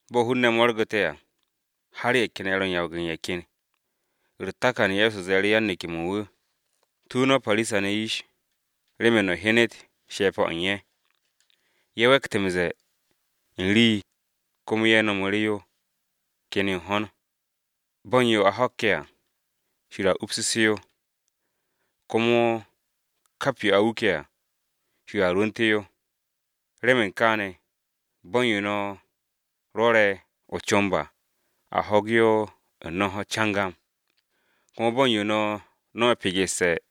Bo̱ hun-ne̱ de̱e̱n mo̱rgu̱te̱ à, har ye̱ ken ye̱ ro̱ m-yawag u̱n ye̱ ken, u̱r-takan Ye̱so ze̱e̱ru̱ yan-neke̱-mo̱ u̱n wu̱, “Tu no̱ Parisa-ne̱ yish remen no̱ hyenet she̱pe̱-o̱ u̱n ye̱. Ye̱ we̱kt m-ze̱e̱ u̱n rii komo ye̱ no̱mu̱ru̱ yo ken yo u̱n ho̱n. Bo̱ u̱n yo a ho̱kke̱ à, Shir a upsu̱sse̱ yo, komo kap yo a wuke̱ à, Shir a rwu̱u̱nte̱ yo. Remen kaane̱, bo̱ u̱n yo no̱ rwo̱re̱ o-comb à, a ho̱ge̱ yo u̱n no̱n-ho̱ cangam, komo bo̱ u̱n yo no̱ no̱me̱ pegesse̱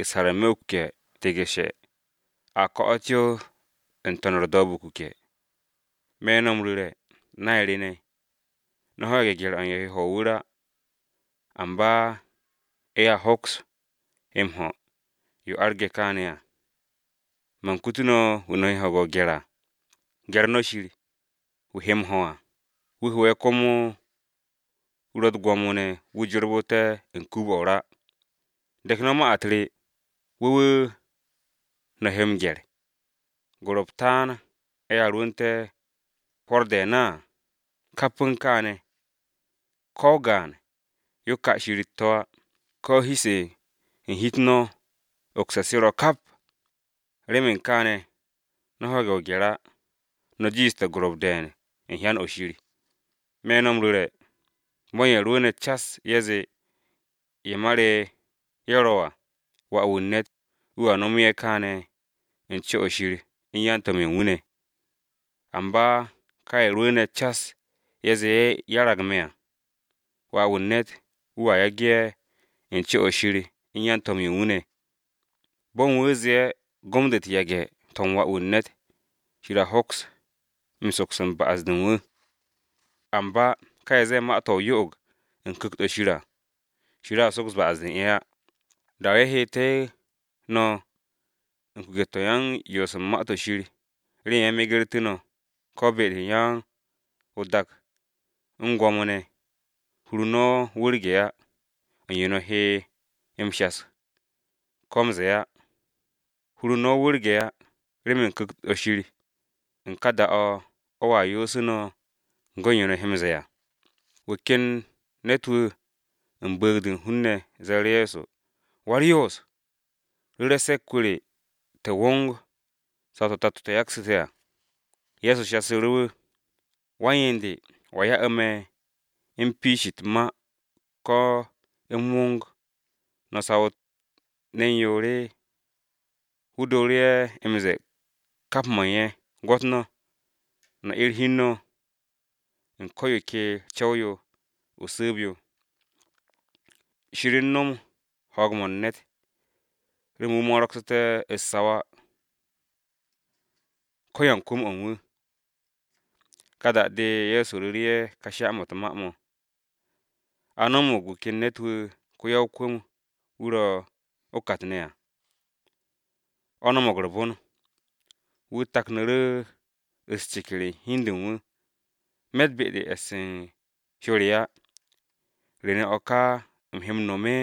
u̱s-har n-me̱ o-kuke̱ tigu̱she̱, a ko̱'o̱t yo n-to̱n u̱r-do̱o̱b de o-kuke̱. “Me̱ no̱ m-ru̱re̱, nay re ne̱, no̱ ho̱ge̱ gye̱r-o u̱n ye̱ he m-ho̱ o-wu̱r á, amba ye̱a hoks m-no̱m yo arge̱ kaane̱ á. Man kutu no̱ wu̱ no̱ he m-gye̱r à: Gye̱r no̱ Shir, wu̱ he m-ho̱ à, wu̱ ho̱'e̱ komo wu̱ ro̱ u̱t-gwo̱mo ne̱ wu̱ jorbu̱te̱ u̱n den-o̱ o-ra. De̱k no̱ ma-u̱t re, wu̱ wu̱ no̱ he m-gye̱r! “Gorop taan ye̱a rwu̱u̱nte̱ hwo̱r de̱e̱n á. Kap u̱n kaane̱ ne̱, ko o-gaan yo ka Shir u̱t-to̱ á. Ko̱ hi-se u̱n hi-u̱t no̱ ogse̱ se̱ ro̱ kap. Remen kaane̱ no̱ ho̱ge̱ o-gye̱r á, no̱ jiishte̱ gorop de̱e̱n u̱n hyan-o̱ Shir. “Me̱ no̱ m-ru̱re̱, bo̱ u̱n ye̱ rwu̱u̱ne̱ cas ye̱ zee ye̱ ma re ye̱ ro̱ à, Wà-wu̱ u̱n ne̱t wu̱a no̱me̱ ye̱ kaane̱ u̱n co-o̱ u̱n Shir u̱n yan-to̱m-ye̱ u̱n wu̱ ne̱. Amba ka ye̱ rwu̱u̱ne̱ cas ye̱ zee ye̱ 'yarag me̱ à, Wà-wu̱ u̱n ne̱t wu̱a 'yer ye̱ u̱n co-o̱ u̱n Shir u̱n yan-to̱m-ye̱ u̱n wu̱ ne̱. “Bo̱ u̱n wu̱ zee gom-de u̱t-yage̱ to̱ u̱n Wà-wu̱ u̱n ne̱t, Shir a hoks m-soks ba'as-de u̱n wu̱. Amba ka ye̱ zee ma-to̱ o-yo'og u̱n Ku̱kt-o̱ Shir à, Shir a soks ba'as-de u̱n ye̱ á. “Da-o̱ ye̱ heetu̱ no̱ u̱n kuke̱-to̱ u̱n yoos u̱n Ma-to̱ Shir remen ye̱ megertu̱ no̱ ko be-de u̱n ya-o-dak u̱n gwo̱mo-ne̱, hur-u̱r no̱ wu̱rge̱ á, u̱n yo no̱ he m-shas á, ko m-ze̱e̱ á. Hur u̱n no̱ wu̱rge̱ á, remen Ku̱kt-o Shir u̱n ka da-o̱ o̱a yoosu̱ no̱ go̱ u̱n yo no̱ he m-ze̱e̱ à.” Wu̱ ken ne̱t-wu̱ u̱n bu̱u̱g-de u̱n hun-ne̱ ze̱e̱ru̱ Ye̱so, “Wa-u̱r-Yoos, ru̱re̱ se̱k-wu̱ re te̱ wong saw-to̱ tato te̱ yaksu̱ te̱ à.” Ye̱so shasu̱ru̱ wu̱, “Wan-yen de, ¿wo̱a ya'u̱ me̱ m-piish u̱t-ma ko u̱m wong no̱ u̱t-saw ne̱n yoor?” Wu̱ dooru̱ ye̱ m-ze̱e̱ kap mo̱ u̱n ye̱, “Gwo̱t no̱, no̱ 'er hi u̱n no̱, u̱n ko̱ yo ke co̱w-yo o-su̱u̱b yo. Shir no̱m ho̱o̱g-mo̱ u̱n ne̱t, remen wu̱ mo̱ro̱gsu̱te̱ u̱t-saw á, ko-yan-kwu̱m-o̱ u̱n wu̱.” Ka da-de Ye̱so ru̱ru̱ ye̱ ka sha-mo̱ u̱t-ma mo̱: “A no̱mo̱g wu̱ ken ne̱t-wu̱ ko-ya-o-kwu̱m-wu̱ ro̱ o-kat ne̱ à, o̱ no̱mo̱g u̱r-bon. Wu̱ taknu̱ru̱ u̱s-ceker u̱n hi u̱n de u̱n wu̱, ‘Me̱tt be-de u̱n e̱s u̱n hyo re á. ¿Re ne̱ o̱ ka u̱m he m-no̱m?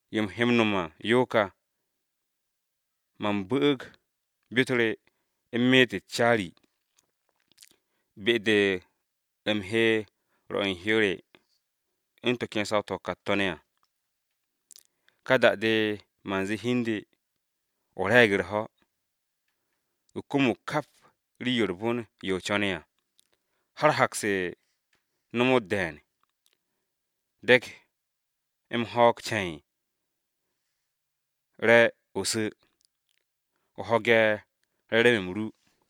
Yo u̱m he m-no̱m à yo ka: Man bu̱'u̱g byo-u̱t re u̱m meet u̱t-caari, be-de u̱m he rwo̱ u̱n hyo re u̱n to̱ ken saw-to̱ o-kat to̱ ne̱ à. Ka da-de man zee hi u̱n de, o re̱e̱g u̱r-ho̱! O kumug kap rii-yo u̱r-bon yo o co̱ne̱ à, har hak-se no̱mo̱t de̱e̱n. Dek m-ho̱o̱g ce̱e̱n, re̱ o su̱, o ho̱ge̱ re̱re̱m-m ru.’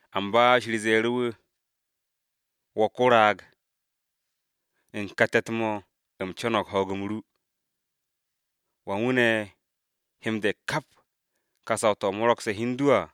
“Amba Shir ze̱e̱ru̱ wu̱, ‘Wo̱ ko-raag! U̱n ka te̱t-mo̱ u̱m co̱no̱g ho̱o̱g-m ru, ¿wa u̱n wu̱ ne̱ he m-de̱k kap ka saw-to̱ o mo̱ro̱gse̱ hi u̱n du à?’”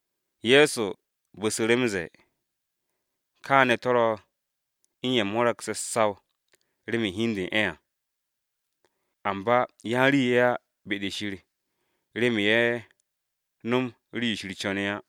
Ye̱so bu̱su̱ru̱ m-ze̱e̱, “Kaane̱ to̱ ro̱ u̱n ye̱ mo̱ro̱gse̱ u̱t-saw remen hi u̱n de u̱n ye̱ à, amba yan-rii ye̱ á be-de Shir remen ye̱ no̱m rii-yo Shir co̱ne̱ á.”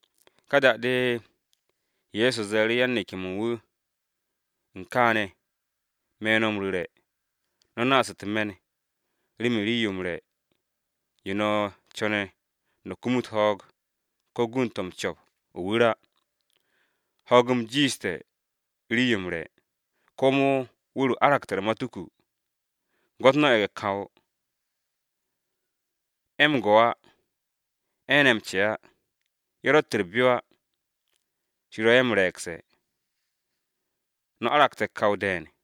Ka da-de Ye̱so ze̱e̱ru̱ yan-neke̱-mo̱ u̱n wu̱, “U̱n kaane̱, me̱ no̱ m-ru̱re̱, no̱ naas u̱t-me̱n remen rii-yo m-re̱ yo no̱ co̱ne̱ no̱ kumut ho̱o̱g, ko gund-to̱ m-co̱p o-wu̱r á. Ho̱o̱g-m jiishte̱ rii-yo m-re̱, komo wu̱r-o aragte̱ u̱r-matuku. Gwo̱t no̱ ye̱ge̱-kanwo, ye̱ m-go̱ á, ye̱ ne̱ m-ce á, ye̱ ro̱tt u̱t-byo á. Shir ro̱ ye̱ m-re̱e̱gte̱! No̱ aragte̱ kawon de̱e̱n!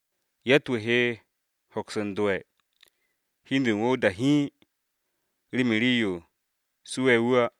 Yatt-wu̱ he hoks u̱n dowe̱ hi u̱n de u̱n wu̱ o-da hiin remen rii-yo suwe̱ wu̱ à.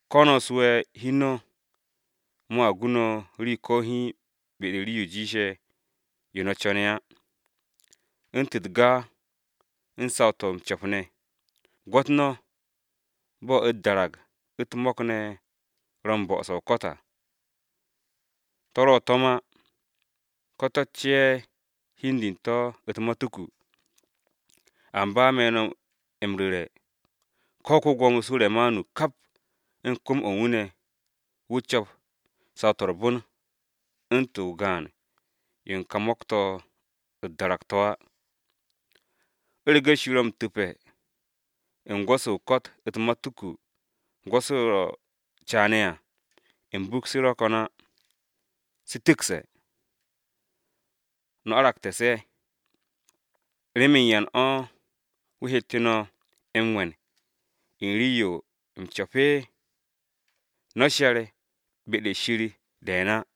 Ko no̱ suwe̱ hi u̱n no̱ mo̱a gu no̱ rii ko̱ hiin be-de u̱n rii-yo jiishe̱ yo no̱ co̱ne̱ á u̱ntu̱n u̱t-ga u̱n saw-to̱ m-co̱p ne̱. Gwo̱t no̱ bo̱ u̱t-darag u̱t-mo̱k ne̱ ro̱ u̱n m-bo̱'o̱se̱ o-ko̱t à. To̱ ro̱ m-gwo̱w á, ko to̱ ce'e̱ hi u̱n de u̱n to̱ u̱t-matuku. Amba me̱ no̱ m-ru̱re̱, ko ko-Gwo̱mo Suremanu kap u̱n kwu̱m-o̱ u̱n wu̱ ne̱, wu̱ co̱p saw-to̱ u̱r-bon u̱ntu̱n o-gaan yo u̱n ka mo̱k-to̱ u̱t-darag to̱ á. U̱rege̱ Shir ro̱ m-tu̱pe̱ u̱n gwo̱-se o-ko̱t u̱t-matuku gwo̱-se ro̱ caane̱ à, m-buk se̱ ro̱ ko̱n á, se̱ tu̱kse̱. No̱ aragte̱ se̱, ¿remen yan o̱ wu̱ hette̱ no̱ m-we̱n u̱n rii-yo m-co̱pe? No̱ she̱r be-de Shir de̱e̱n á!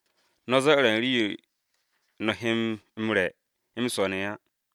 “No̱ zo̱'o̱re̱ u̱n rii-yo no̱ he m-re̱ m-swo̱ ne̱ á.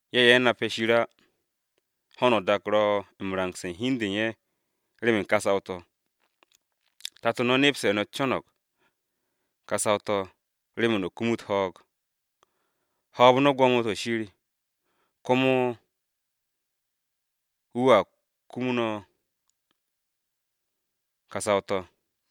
(Ye̱ ye̱ nape̱ Shir á, ho̱no o-dak ro̱ m-rangse̱ u̱n hi u̱n de u̱n ye̱ remen ka saw-to̱.) Tato no̱ nepse̱ no̱ co̱no̱g ka saw-to̱ remen no̱ kumut ho̱o̱g. Hoob no̱ gwo̱mo-to̱ u̱n Shir, komo wu̱a kumu no̱ ka saw-to̱.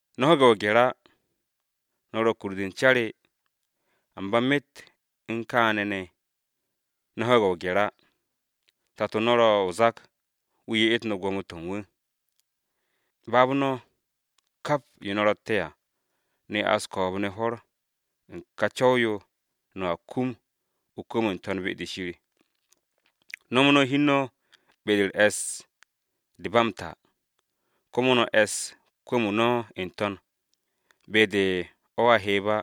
“No̱ ho̱ge̱ o-gye̱r á, no̱ kur-de u̱n ca re, amba myet u̱n kaane̱ ne̱ no̱ ho̱ge̱ o-gye̱r á. Tato no̱ ro̱ o-zak, wu̱ ye'et no̱ gwo̱mo-to̱ u̱n wu̱. Baab no̱ kap yo no̱ ro̱tte̱ à, no̱ ya'as ko̱o̱b-ne̱ hwo̱r u̱n ka co̱w-yo no̱a kum o-kwu̱m n-To̱n be-de Shir. Nomo no̱ hi u̱n no̱ be-de u̱r-e̱ss de ba m-ta, komo no̱ e̱s kwu̱m-o̱ no̱ n-to̱n, be-de o̱a heeb á,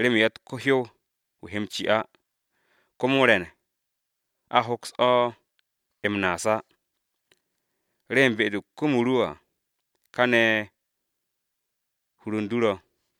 remen yatt ko-hyow-wu̱ he m-ci á, komo re̱n a hoks o̱ m-naas á. Remen be-de kwu̱m-o ru ro̱ à, káne̱ hur u̱n du ro̱.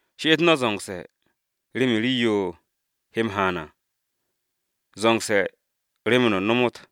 “She'et no̱ zo̱ngse̱ remen rii-yo he m-haan à zo̱ngse̱ remen no̱ nomot,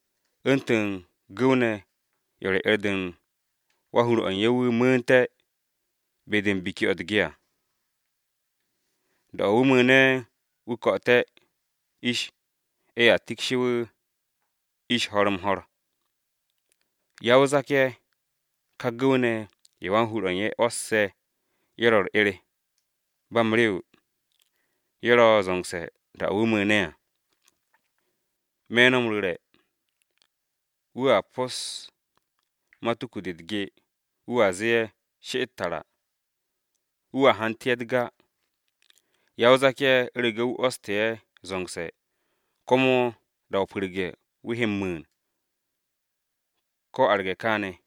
u̱ntu̱n gu̱w-ne̱ ye̱ ro̱ 'er-de u̱n wan-hur-o̱ u̱n ye̱ wu̱ mu̱u̱nte̱ be-de u̱n biki-o̱ u̱t-ge à. Da-o̱ wu̱ mu̱u̱ne̱ wu̱ ko̱'o̱te̱ ish, ye̱a tikshe̱ wu̱ ish ho̱r-m-ho̱r. Ya-o-zak-ye̱ ka gu̱w-ne̱ ye̱ wan-hur-o̱ u̱n ye̱ 'wo̱sse̱ ye̱ ro̱ u̱r-'er ba m-rew, ye̱ ro̱ zo̱ngse̱ da-o̱ wu̱ mu̱u̱ne̱ à! Nip-o̱ me̱ no̱ m-ru̱re̱, wu̱a pos matuku-de u̱t-ge, wu̱a zee ye̱ she'et tara, wu̱ hantu̱ ye̱ u̱t-ga. Ya-o-zak-ye̱ u̱rege̱ wu̱ 'wo̱ste̱ ye̱ zo̱ngse̱, komo da-o pu̱rge̱ wu̱ he m-mu̱u̱n ko̱ arge̱ káne̱!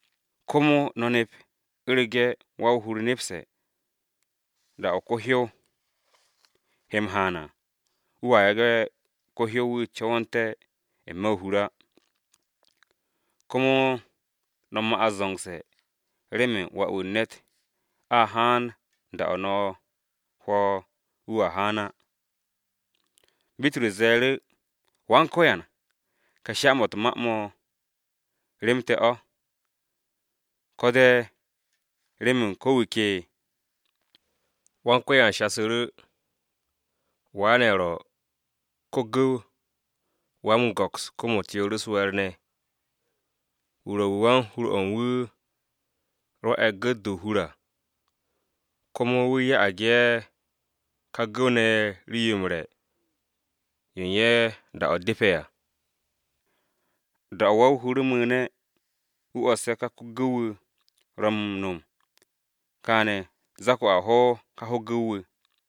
Komo no̱ nep u̱rege̱ wa-o-hur nepse̱ da-o̱ ko-hyow he m-haan à wu̱a yage̱ ko-hyow-wu̱ co̱wo̱nte̱ n-me̱ o-hur á. Komo no̱ ma'as zo̱ngse̱, remen Wà-wu̱ u̱n ne̱t a haan da-o̱ no̱ hwo̱ wu̱a haan á.” Bitrus ze̱e̱ru̱, “Go̱s-wu̱, ¿ka sha-mo̱ u̱t-ma mo̱ rem te̱ o̱, ko de remen ko̱ wu̱ ke?” Go̱s-wu̱ shasu̱ru̱, “¿Wa ne̱ ro̱, ko-gu̱w wa-m-go̱ks kom-u̱t yoor u̱s-we̱e̱r ne̱? Wu̱ ro̱ wu̱ wan-hur-o̱ u̱n wu̱ rwo̱'e̱ gu̱t-de o-hur à, komo wu̱ ya'ag ye̱ ka gu̱w-ne̱ ye̱ rii-yo m-re̱ yo u̱n ye̱ da-o̱ depe̱ à. Da-o̱ wa-o-hur mu̱u̱ne̱, wu̱ 'o̱sse̱ ka ko-gu̱w-wu̱ ro̱ m-no̱m kaane̱, zak-o a ho̱ ka ko-gu̱w-wu̱!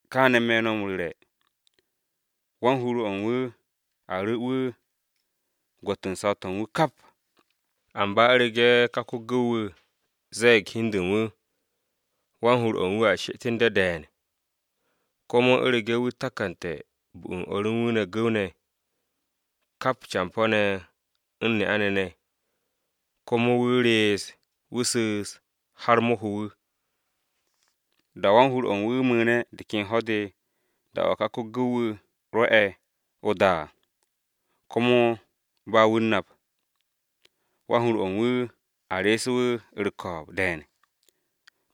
Kááne̱ me̱ no̱ m-ru̱re̱, wan-hur-o̱ u̱n wu̱ a ru̱ wu̱ gwo̱t u̱n saw-to̱ u̱n wu̱ kap. Amba u̱rege̱ ka ko-gu̱w-wu̱ ze̱e̱g hi u̱n de u̱n wu̱, wan-hur-o̱ u̱n wu̱a she'et u̱n de de̱e̱n. Komo u̱rege̱ wu̱ takante̱ bu u̱n o̱r u̱n wu̱ gu̱w-ne̱, kap campo̱-ne̱ u̱n ne'a-ne̱ ne̱, komo wu̱ rees, wu̱ su̱u̱s har mo̱ ho wu̱, da-o̱ wan-hur-o̱ u̱n wu̱ mu̱u̱ne̱ de ken ho̱-de da-o̱ ka ko-gu̱w-wu̱ rwo̱ ye̱ o-da á, komo ba wu̱ u̱n nap. Wan-hur-o̱ u̱n wu̱ a re̱e̱se̱ wu̱ u̱r-ko̱o̱b de̱e̱n,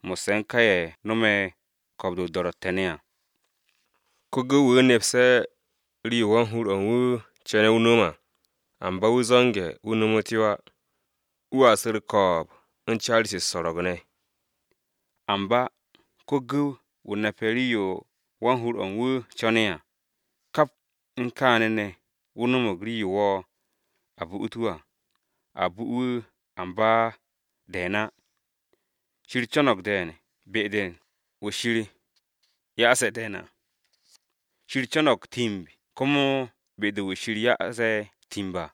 mo̱sse̱ u̱n ka ye̱ yage̱ dor Ye̱so à. “Ko-gu̱w-wu̱ nepse̱ rii-yo wan-hur-o̱ u̱n wu̱ co̱ne̱ wu̱ no̱m à, amba wu̱ zo̱nge̱ wu̱ nomot yo á, wu̱a su̱ u̱r-ko̱o̱b u̱n caari-se u̱s-so̱ro̱g ne̱. Amba ko-gu̱w-wu̱ nape̱ rii-yo wan-hur-o̱ u̱n wu̱ co̱ne̱ á, kap u̱n kaane̱ ne̱ wu̱ no̱mo̱g rii-yo wo̱, a bu'ut wu̱ à, a bu wu̱ amba de̱e̱n á. Shir co̱no̱g de̱e̱n be-de u̱n wu̱ Shir ya'ase̱ de̱e̱n à. Shir co̱no̱g timb komo be-de u̱n wu̱ Shir ya'ase̱ timb à.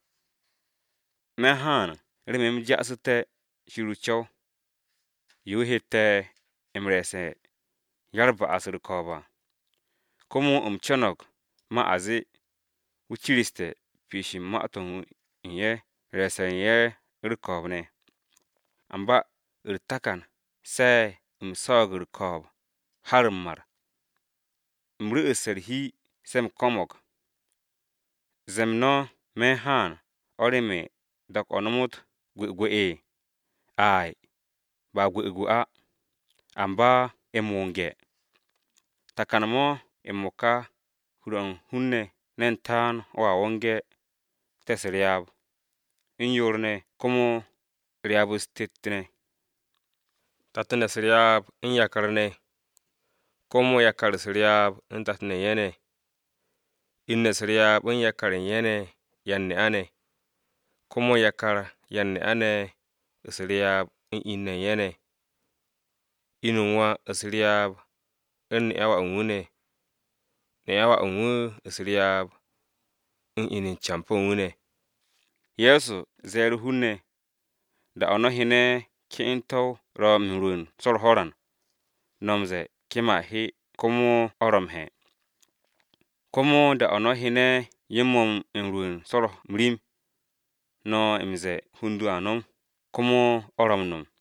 “Me̱ u̱n haan remen u̱m ja'asu̱té̱ Shir o-co̱w, yo wu̱ hette̱ m-re̱e̱se̱ u̱n ya-u̱r-ba'as u̱r-ko̱o̱b à. Komo u̱m co̱no̱g ma a zee, wu̱ ciriste̱ piish u̱n ma-to̱ u̱n ye̱ u̱n re̱e̱se̱ u̱n ye̱ u̱r-ko̱o̱b ne̱. Amba u̱r-takan, se̱ u̱m swo̱o̱g u̱r-ko̱o̱b har m-mar. U̱m ru̱'u̱sse̱ u̱r-hi se u̱m ko̱mo̱g. ¿Ze̱e̱-m no̱ me̱ u̱n haan o̱ remen dak-o̱ nomot gwu̱gwu̱? Ay, ba gwu̱gwu̱ á, amba m-wonge̱. Takan-mo̱ m-mo̱ka hur-o̱ u̱n hun-ne̱ ne̱n taan o̱a wonge̱, tet u̱s-ryaab, u̱n yoor ne̱ komo yoor u̱s-ryaab, u̱n tet ne̱. Tat-ne̱ u̱s-ryaab u̱n yakar-ne̱, komo yakar u̱s-ryaab u̱n tato u̱n ye̱ ne̱. In-ne̱ u̱s-ryaab u̱n yakar-ye̱ u̱n ye̱ ne̱ yan-ne'a-ne̱, komo yakar yan-ne'a-ne̱ u̱s-ryaab u̱n in-ne̱ u̱n ye̱ ne̱. Inu u̱n wà u̱s-ryaab u̱n ne'a-wu̱ u̱n wà ne̱, ne'a-wu̱ u̱n wà u̱s-ryaab u̱n inu u̱n campo̱ u̱n wu̱ ne̱.” Ye̱so ze̱e̱ru̱ hun-ne̱, “Da-o̱ no̱ hyene̱ ke'ente̱-o ro̱ m-rwu̱u̱n so̱ u̱r-ho̱ran, no̱ m-ze̱e̱ kem a he, komo o̱ ro̱ m-he̱. Komo da-o̱ no̱ hyene̱ yo-mo̱ m-rwu̱u̱n so̱ u̱r-ho̱rim, no̱ m-ze̱e̱ hund a no̱m, komo o̱ ro̱ m-no̱m.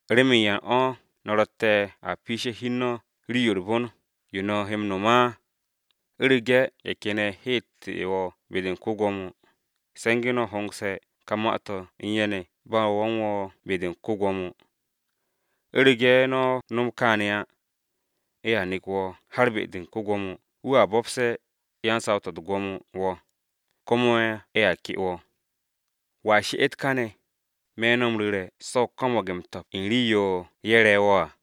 “¿Remen yan o̱ no̱ ro̱tte̱ a piishe̱ hi u̱n no̱ rii-yo u̱r-bon yo no̱ he m-no̱m á? U̱rege̱ ye̱ ken ye̱ he'ette̱ wo̱ be-de u̱n ko-Gwo̱mo, se̱nge̱ no̱ hongse̱ ka ma-to̱ u̱n ye̱ ne̱ ba no̱ u̱n wo̱ be-de u̱n ko-Gwo̱mo. U̱rege̱ no̱ no̱m káane̱ á, ye̱a nek wo̱ har be-de u̱n ko-Gwo̱mo, wu̱a bo̱pse̱ yan-saw-to̱ u̱t-gwo̱mo wo̱, komo ye̱a ke wo̱. Wo̱a she'et káne̱, me̱ no̱ m-ru̱re̱ se̱ o ko̱mo̱g m-to̱p u̱n rii-yo ye̱ re̱ wo̱ à.”